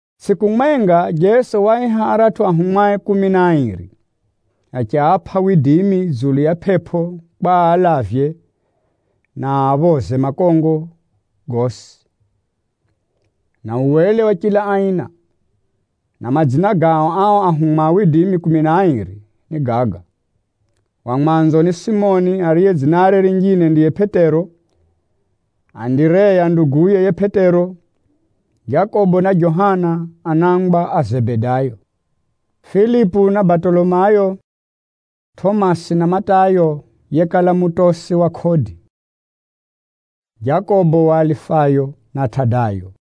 Tsʼiku mwenga, Jeso waaiha aratʼu anafunzie kumi na airi, achiapʼa widimi dzulu ya pʼepʼo kwa aalavye, na aphoze makongo gosi, na uwele wa chila aina. Na madzina gao ao ahumwa a Jeso kumi na airi ni gaga: Wa mwanzo ni Simoni (ariye dzinare rinjine ndiye Pʼetero), Andireya nduguye yiye Pʼetero, Jakobo na Johana anangwa a Zebedayo, Filipu na Batolomayo, Tʼomasi na Matayo yekala mutosi wa kodi, Jakobo wa Alifayo na Tadayo,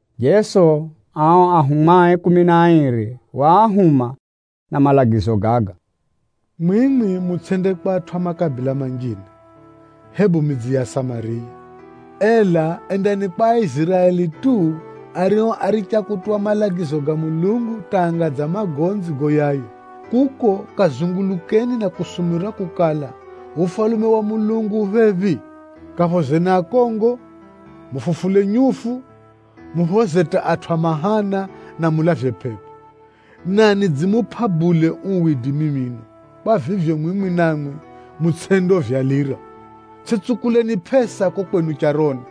Jeso ao anafunzie kumi na airi waahuma na malagizo gaga: “Mwimwi mutsʼende kwa atʼu a makabila manjine, hebu midzi ya Asamariya. Ela endani kwa Aiziraeli tu, ario áricha kutuwa malagizo ga Mulungu hata anga dza magonzi goyaya. Kuko, kazungulukeni na kusumurira kukala, ‘Ufalume wa Mulungu u phephi.’ Kaphozeni akongo, mufufule nyufu, muphoze hata atʼu a mahana, na mulavye pʼepʼo. Na nidzimupʼa bule uu widimi mino, kwa vivyo mwimwi namwi, mutsʼendeuvyalira. Tsʼitsukuleni pʼesa kuko kwenu charoni.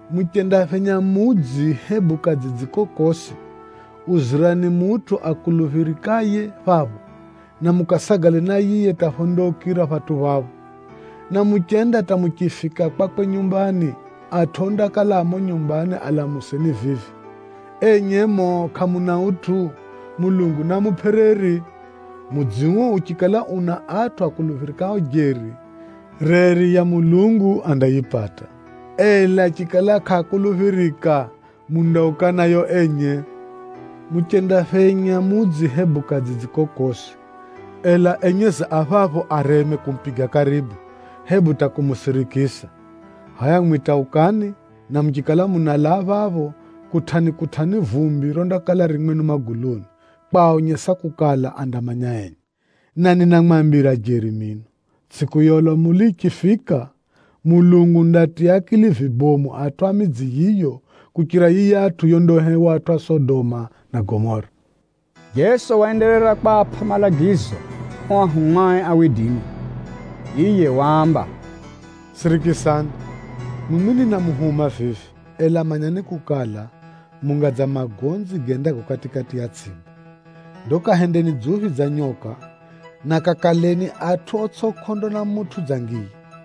Muchendaphenya mudzi hebu kadzidzi kokosi, uzirani mutʼu akuluphirikaye phapho, na mukasagale na yiye hata phondaukira phatʼu phapho. Na muchenda hata muchifika kwakwe nyumbani, atʼu ondakala a mumo nyumbani alamuseni vivi, ‘Enye muno kʼamuna utʼu? Mulungu naamupʼe reri.’ Mudzi uo uchikala una atʼu akuluphirikao jeri, reri ya Mulungu andayipata, ela chikala kʼaakuluphirika, mundauka nayo enye. Muchendaphenya mudzi hebu kadzidzi kokosi, ela enyezi a phapho areme kumupiga karibu, hebu hata kumusirikisa, hʼaya mwimwi hata ukani, na muchikala munalaa phapho, kutʼani-kutʼani vumbi rondakala ririro mwenu maguluni, kwaonyesa kukala andamanya enye. Na ninamwambira jeri mino, tsʼiku ya ulamuli yichifika, Mulungu undaatiya akili vikali atʼu a midzi yiyo kuchira yiyatʼu yondahewa atʼu a Sodoma na Gomora.” Jeso waenderera kwapʼa malagizo ao anafunzie. Yiye waamba, “Sirikisani, mwimwi ninamuhuma vivi, ela manyani kukala, munga dza magonzi gendago kati-kati ya tsʼimba. Ndo kahendeni dzuphi dza nyoka, na kakaleni atʼu otsʼi kʼondo na mutʼu dza ngiya.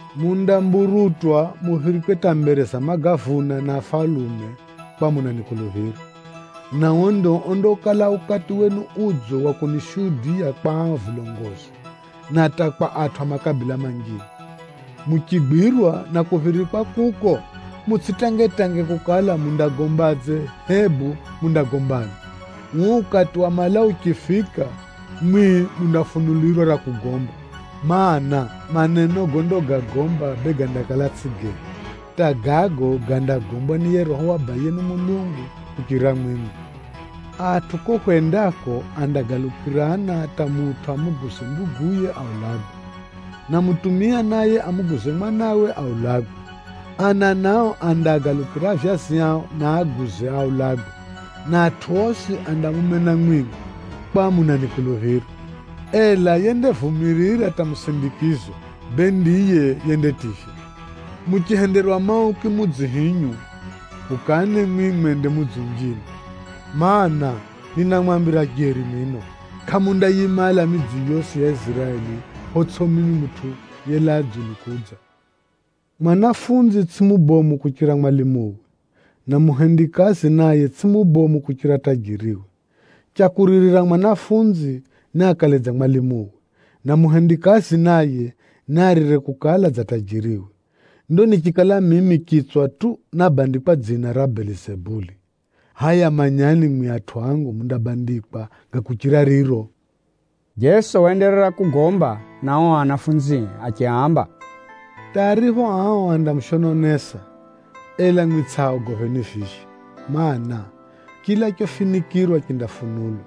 Mundamburutwa muphirikwe hata mbere za magavuna na afalume kwakukala munanikuluphira. Na uo ndio ondakala ukati wenu udzo wa kunishuhudiya kwa ao vilongozi, na hata kwa atʼu a makabila manjine. Muchigwirwa na kuphirikwa kuko, mutsʼitangetange kukala mundagombadze hebu mundagombani. Uo ukati wa malau uchifika, mwimwi mundafunulirwa ra kugomba, mana, maneno gondagagomba bee gandakala tsʼigo genu, hata gago gandagombwa ni yiye Roho wa Abayenu Mulungu kuchirira mwimwi. “Atʼu kuko hwendako andagalukirana hata mutʼu amuguze nduguye mwenye aulagwe, na bemutʼu naye amuguze mwanawe mwenye aulagwe. Ana nao andaagalukira avyazi ao na aaguze aulagwe, na atʼu osi andamumena mwimwi, kwakukala munanikuluphira. Ela yendavumirira hata musindikizo, bee ndiye yendativywa. Muchihenderwa mauku mudzi hinyu, ukani mwimwi mwende mudzi unjine. Maana, ninamwambira jeri mino, kʼamundayimala midzi yosi ya Iziraeli photsʼi mimi Mutʼu yelaa dzulu kudza. “Mwanafunzi tsʼiye mubomu kuchira mwalimuwe, na muhendikazi naye tsʼiye mubomu kuchira tajiriwe. Cha kuririra mwanafunzi, niakale dza mwalimuwe, na muhendikazi naye, niaririre kukala dza tajiriwe. Ndo nichikala mimi chitswa tu nábandikwa dzina ra Belizabuli, hʼaya manyani mwimwi atʼu angu mundabandikwa ga kuchira riro.” Jeso waenderera kugomba na ao anafunzie achiaamba, “Hata aripho ao andamushononesa, ela mwimwi tsʼiaogopheni vivyo. Maana, chila chofinikʼirwa chindafunulwa,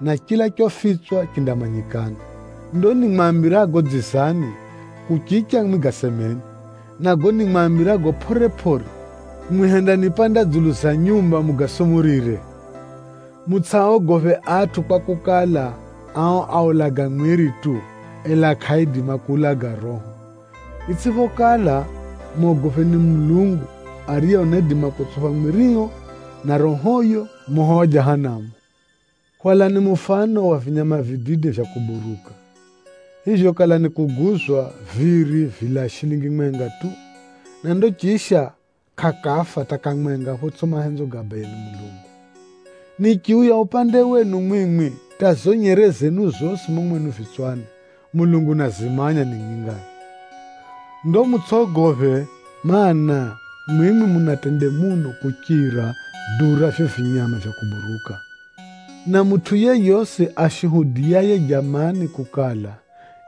na chila chofitswa chindamanyikana. Ndo nimwambirago dzizani, kuchicha mwimwi gasemeni, na gago nimwambirago pʼore-pʼore, mwimwi hendanipanda dzulu ya nyumba mugasumurire. Mutsʼiaogophe atʼu kwakukala, ao aulaga mwiri tu, ela kʼaaidima kuulaga roho. Itsʼiphokala, mogopheni Mulungu, ariye unaidima kutsupha mwirio na rohoyo moho wa Jahanamu. Hwalani mufano wa vinyama vidide vya kuburuka. Vivyo kala nikuguzwa, viri vilaa shilingi mwenga tu, na ndo chisha, kʼakafa hata kamwenga photsʼipho mahenzo ga Abayenu Mulungu. Nichiuya upande wenu mwimwi, hata zizo nyere zenu zosi mumo mwenu vitswani, Mulungu unazimanya ni nyingaphi. Ndo mutsʼogophe, mana, mwimwi muna tende muno kuchira duu ra vivyo vinyama vya kuburuka! “Na mutʼu yeyosi ashuhudiyaye jamani kukala,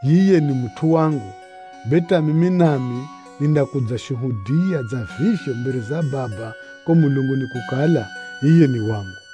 yiye ni mutʼu wangu, bee hata mimi nami nindakudzashuhudiya dza vivyo mbere za Baba kuko mulunguni kukala, yiye ni wangu.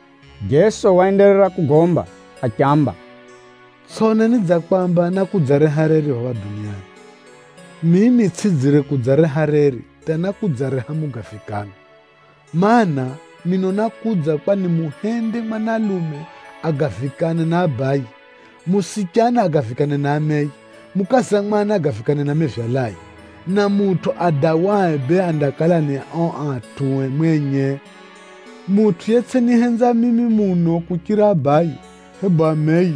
Jeso waenderera kugomba achiamba, “Tsʼoneni dza kwamba nákudzareha reri phapha duniani. Mimi tsʼidzire kudzareha reri, hata nákudzareha mugavikano. Maana, mino nákudza kwa nimuhende mwanalume agavikane na abaye, mwana wa chiche agavikane na ameye, mukaza mwana agavikane na mevyalaye, na mutʼu adawae bee andakala ni ao atʼue mwenye. “Mutʼu yetsʼinihenza mimi muno kuchira abaye, hebu ameye,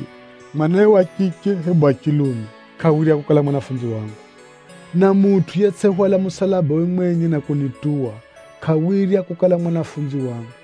mwanawe wa chiche, hebu wa chilume, kʼawirya kukala mwanafunzi wangu. Na mutʼu yetsʼihwala musalabawe mwenye na kunituwa, kʼawirya kukala mwanafunzi wangu.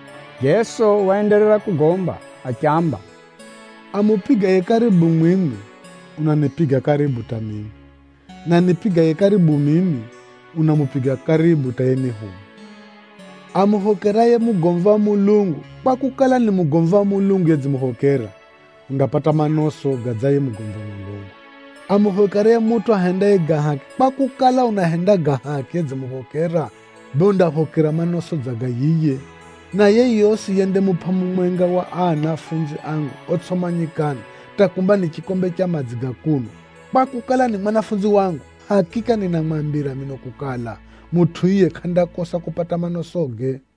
Jeso waenderera kugomba achiamba, “Amupigaye karibu mwimwi, unanipiga karibu hata mimi, na anipigaye karibu mimi, unamupiga karibu hata yenihuma. Amuphokeraye mugomvi wa Mulungu, kwakukala, ni mugomvi wa Mulungu yedzimuphokera, undapata manoso dza ga yiye mugomvi wa Mulungu. Amuphokeraye mutʼu ahendaye ga haki, kwakukala, unahenda ga haki yedzimuphokera, bee undaphokera manoso dza ga yiye. Na yeyosi yendamupʼa mumwenga wa aa anafunzi angu otsʼimanyikana hata kumba ni chikombe cha madzi ga kunwa, kwakukala, ni mwanafunzi wangu, ninamwambira jeri mino kukala, mutʼu yiye kʼandakosa kupata manosoge.”